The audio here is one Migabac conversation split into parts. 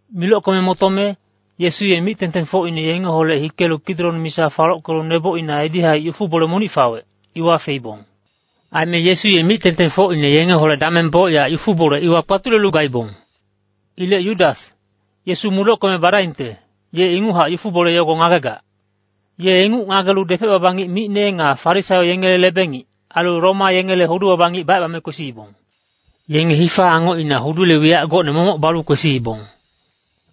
Milockeme motome, Yesu ye mic-tengtengfocine yengeholec hikelu Kidrong misa falockelu nebocina edi-haic yufu-bole monic fawec, iwa feibong. Aime Yesu ye mic-tengtengfocine yengeholec dameng bocyac yufu-bole iwa kpatulelu gaibong. Ilec Yudas, Yesu mudockeme badaingte, ye inguchac yufu-bole yogo ngagegac. Ye inguc ngagelu depec-baba ngic micne nga Farisaio yengele lebe-ngic, ailu Roma yengele hudu-baba ngic bacebame kwesiibong. Yenge hifa nga angoc ailu hudule wiyac gocne momoc balu kwesiibong.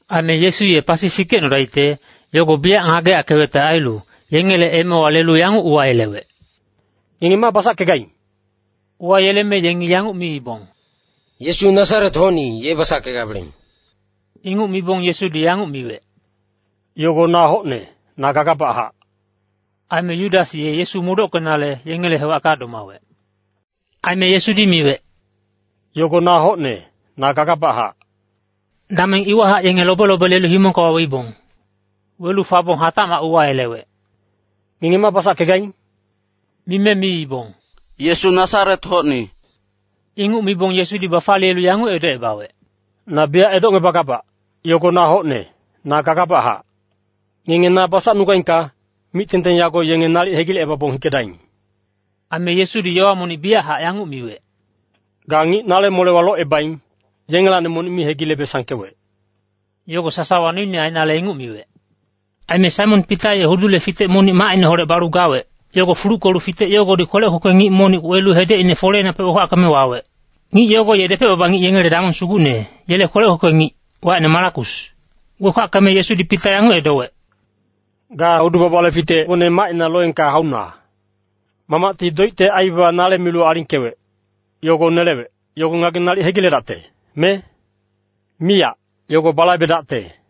Aime Yesu ye pasi fikecnodaicte, yogo biyac ngageyackewecte ailu, yengele emewa lelu yanguc uwayelewec, “Ngenge ma basackegaing?” Uwayeleme yengi yanguc miibong, “Yesu Nasaret-hocni, ye basackegabeleng.” Inguc mibong Yesudi yanguc miwec, “Yogo na hocne, na gagabachac.” Aime Yudas ye Yesu mudockenale, yengele hewacka domawec. Aime Yesudi miwec, “Yogo na hocne, na gagabachac,” dameng iwahac yenge lobe-lobe lelu himongka waweibong. Welu fabong hatacmac uwayelewec, “Ngenge ma basackegaing?” Mime miibong, “Yesu Nasaret-hocni.” Inguc mibong Yesudi bafaliyelu yanguc edocebawec, “Na biyac edocngebagabac, yogo na hocne, na gagabachac. Ngenge na basacnugaingka, mic-tengteng yago yenge nalic hegilecebabong hikedaing.” Aime Yesudi yowa monic biyachac yanguc miwec, “Ga ngic nale molewa locebaing, yengelacni monic mi hegilebe sangkewec.” Yogo sasawa noine ainale inguc miwec. Aime Saimon Pita ye hudule fitec monic macineholec balu gawec, yogo fuluckelu fitec yogodi kwelec kwekwe ngic monic welu hedecine foleinapec wekwackeme wawec. Ngic yogo ye depec-baba ngic yengele damong sugucne, yele kwelec kwekwe ngic, wacine Malakus. Wekwackeme Yesudi Pita yanguc edowec, “Ga hudu-babale fitecgone macina loengka hauna. Mamacti doicte aibaba nale milu alingkewec, yogo nelewec, yogo ngageng nalic hegiledacte, me? Miyac, yogo balaibedacte.”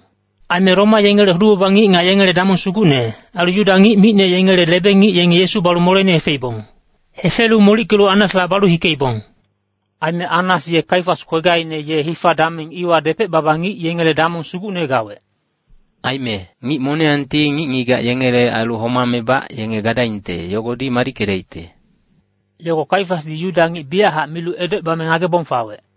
Aime Roma yengele hudu-baba ngic nga yengele damong sugucne, ailu Yuda ngic micne yengele lebe-ngic yenge Yesu balu moleine hefeibong. Hefelu molickelu Annasla balu hikeibong. Aime Annas ye Kaifas kwegaine ye hifa-dameng iwa depec-baba ngic yengele damong sugucne gawec. Aime “ngic moniyangti ngic-ngigac yengele ailu homamebac yenge gadaingte, yogodi madickedaicte,” yogo Kaifasdi Yuda ngic biyachac milu edocebame ngagebong fawec.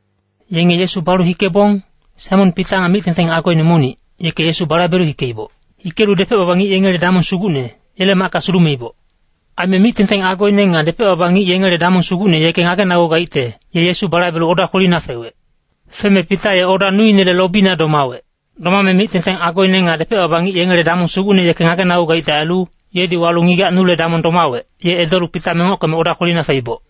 Yenge Yesu balu hikebong, Saimon Pita nga mic-tengteng agoine monic, yeke Yesu balaibelu hikeiboc. Hikelu depec-baba ngic yengele damong sugucne, yele macka sulumeiboc. Aime mic-tengteng agoine nga depec-baba ngic yengele damong sugucne yeke ngagenagugaicte, ye Yesu balaibelu oda kwelina fewec. Feme Pita ye oda nuinele lobina domawec. Domame mic-tengteng agoine nga depec-baba ngic yengele damong sugucne yeke ngagenagugaicte ailu, yedi walu ngigac nule damong domawec, ye edolu Pita mengockeme oda kwelina feiboc.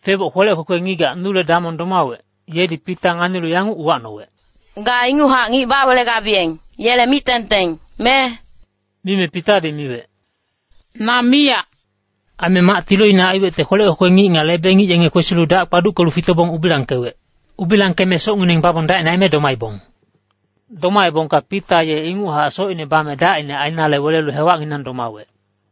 Feboc kwelec kwekwe ngigac nu damong domawec, yedi Pita nganilu yanguc uwacnowec, “Ga inguchac ngic bawelegabiyeng, yele mic-tengteng, me?” Mime Pitadi miwec, “Na miyac.” Aime mac tiloine aiwecte kwelec kwekwe ngic nga lebe-ngic yenge kwesilu dac kpaduckelu fitobong ubilangkewec. Ubilangkeme socngineng babong dacine aime domaibong. Domaebongka Pita ye inguchac socine bame dacine ainale welelu hewacnginang domawec.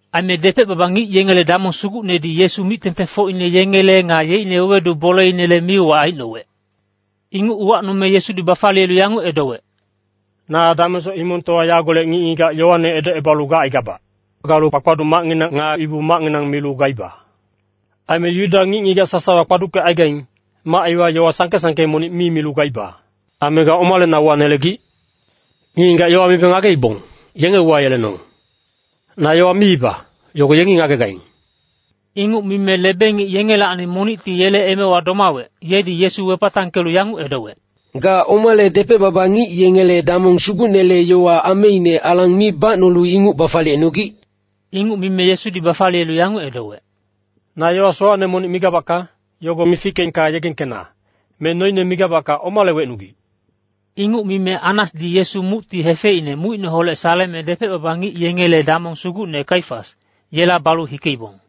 Aime depec-baba ngic yengele damong sugucnedi Yesu mic-tengtengfocine yengele nga yeicne wewedu boleinele mi-uwac aicnowec. Inguc uwacnome Yesudi bafaliyelu yanguc edowec, “Na damengsoc himongtowa yagolec ngic-ngigac yowane edocebalu gacaigabac. Galu kpakpaduc macnginang nga Ibu-macnginang milu gaiba. Aime Yuda ngic-ngigac sasawa kpaduckecaigaing, mac iwa yowa sangke-sangke monic mi milu gaiba. Aime ga omale na uwanelegic? Ngic-ngigac yowa mibe ngageibong, yenge uwayelenong. Na yowa miiba, yogo yengi ngagegaing.” Inguc mime lebe-ngic yengelacni monicti yele emewa domawec, yedi Yesu wepatangkelu yanguc edowec, “Ga omale depec-baba ngic yengele damong sugucnele yowa ameine alang mi bacnolu inguc bafaliyecnogic?” Inguc mime Yesudi bafaliyelu yanguc edowec, “Na yowa sowacne monic migabacka, yogo mifickeengka yegengkena, me noine migabacka omale wecnugic?” Inguc mime Annasdi Yesu mucti hefeicne mucineholec saleme depec-baba ngic yengele damong sugucne Kaifas, yela balu hikeibong.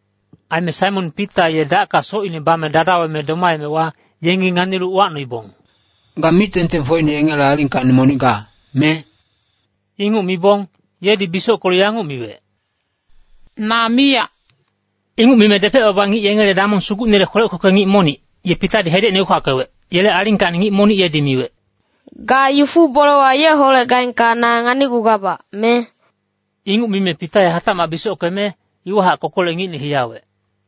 Aime Saimon Pita ye dacka socine bame dadaweme domaemewa, yengi nganilu uwacnoibong, “Ga mic-tengtengfocine yengele alingkacni monic ga, me?” Inguc mibong, yedi bisockelu yanguc miwec, “Na miyac.” Inguc mime depec-baba ngic yengele damong sugucnele kwelec kwekwe ngic monic, ye Pitadi hedecine wekwackewec, yele alingkacni ngic monic yedi miwec, “Ga yufu-bolewa yeholec gaengka na nganicgugabac, me?” Inguc mime Pita ye hatacmac bisockeme, iwahac kokolec ngicne hiyawec.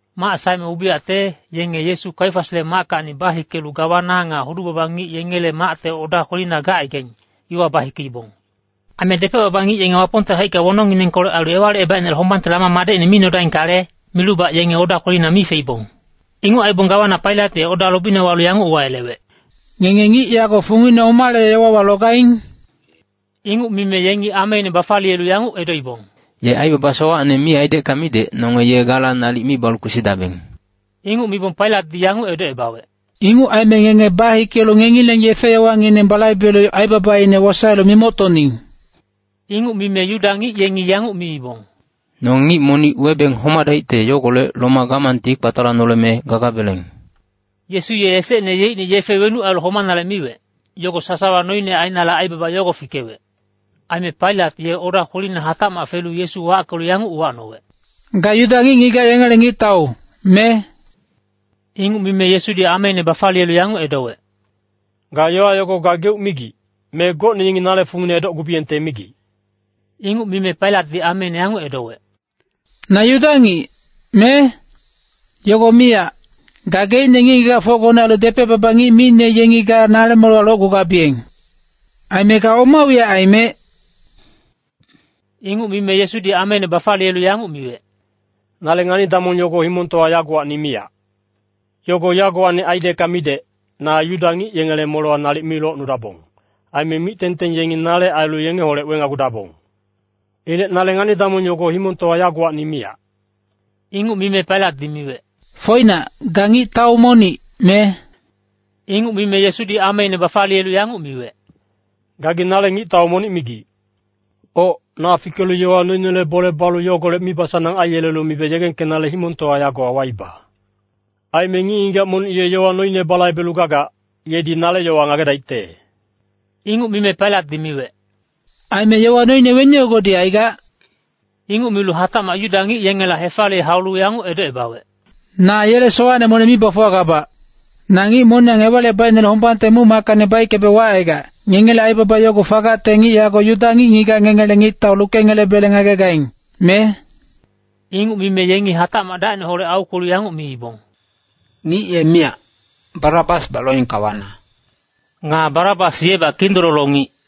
Mac saeme ubiyacte, yenge Yesu Kaifasle mackacni bahikelu gawana nga hudu-baba ngic yengele macte oda kwelina gacaigaing, iwa bahikeibong. Aime depec-baba ngic yenge Wapongte haicka wonongnginengkolec ailu Ewalicebaicnele hombangte lama madecine mi nodaingkale, milubac yenge oda kwelina mi feibong. Inguc aibong gawana Pailat ye oda lobina walu yanguc uwayelewec, “Ngenge ngic yago fungine omale yowawa logaing?” Inguc mime yengi ameine bafaliyelu yanguc edoibong, “Ye aibaba sowacne mi aidecka midec, nonge ye gala nalic mi balu kwesidabeng.” Inguc mibong Pailatdi yanguc edocebawec, “Inguc aime ngenge bahikelu ngengileng yefe-yowangineng balaibelu aibabaine wosaelu mimoctoning.” Inguc mime Yuda ngic yengi yanguc miibong, “Nonge ngic monic webeng homadaicte yogolec Roma gamangti kpatalanoleme gagabeleng.” Yesu ye esecne yeicne yefe wenuc ailu homanale miwec, yogo sasawa noine ainale aibaba yogo fikewec. Aime Pailat ye oda kwelina hatacmac felu Yesu wackelu yanguc uwacnowec, “Ga Yuda ngic-ngigac yengele ngictau, me?” Inguc mime Yesudi ameine bafaliyelu yanguc edowec, “Ga yowa yogo gageuc migic, me gocne yengi nale fungine edocgubiyengte migic?” Inguc mime Pailatdi ameine yanguc edowec, “Na Yuda ngic, me? Yogo miyac. Gageicne ngic-ngigacfocgone ailu depec-baba ngic micne yengi ga nale molewa locgugabiyeng. Aime ga oma wiyac aimec?” Inguc mime Yesudi ameine bafaliyelu yanguc miwec, “Nale ngani-damong yogo himongtowa yagowacni miyac. Yogo yagowacni aidecka midec, na Yuda ngic yengele molewa nalic mi locnudabong. Aime mic-tengteng yengi nale ailu yengeholec wenagudabong. Ilec nale ngani-damong yogo himongtowa yagowacni miyac.” Inguc mime Pailatdi miwec, “Foinac, ga ngictau monic, me?” Inguc mime Yesudi ameine bafaliyelu yanguc miwec, “Gagi nale ngictau monic migic. Oc, na fikelu yowa noinele bole balu yogolec mibasanang aiyelelu mibe yegengkenale himongtowa yagowa waiba. Aime ngic-ngigac monic ye yowa noine balaibelu gagac, yedi nale yowa ngagedaicte.” Inguc mime Pailatdi miwec, “Aime yowa noine weni yogodi aigac?” Inguc milu hatacmac Yuda ngic yengela hefaliye haulu yanguc edocebawec, “Na yele sowacne monic mi bafuwagabac. Na ngic moniyang Ewalicebaicnele hombangte muc-mackacni baickebe wacaigac, ngengele aibaba yogo fagacte ngic yago Yuda ngic-ngigac ngengele ngictau lukengelebele ngagegaing, me?” Inguc mime yengi hatacmac dacineholec aukwelu yanguc miibong, “Ngic ye miyac, Barabasbac loengka wana.” Nga Barabas yebac kindololo ngic.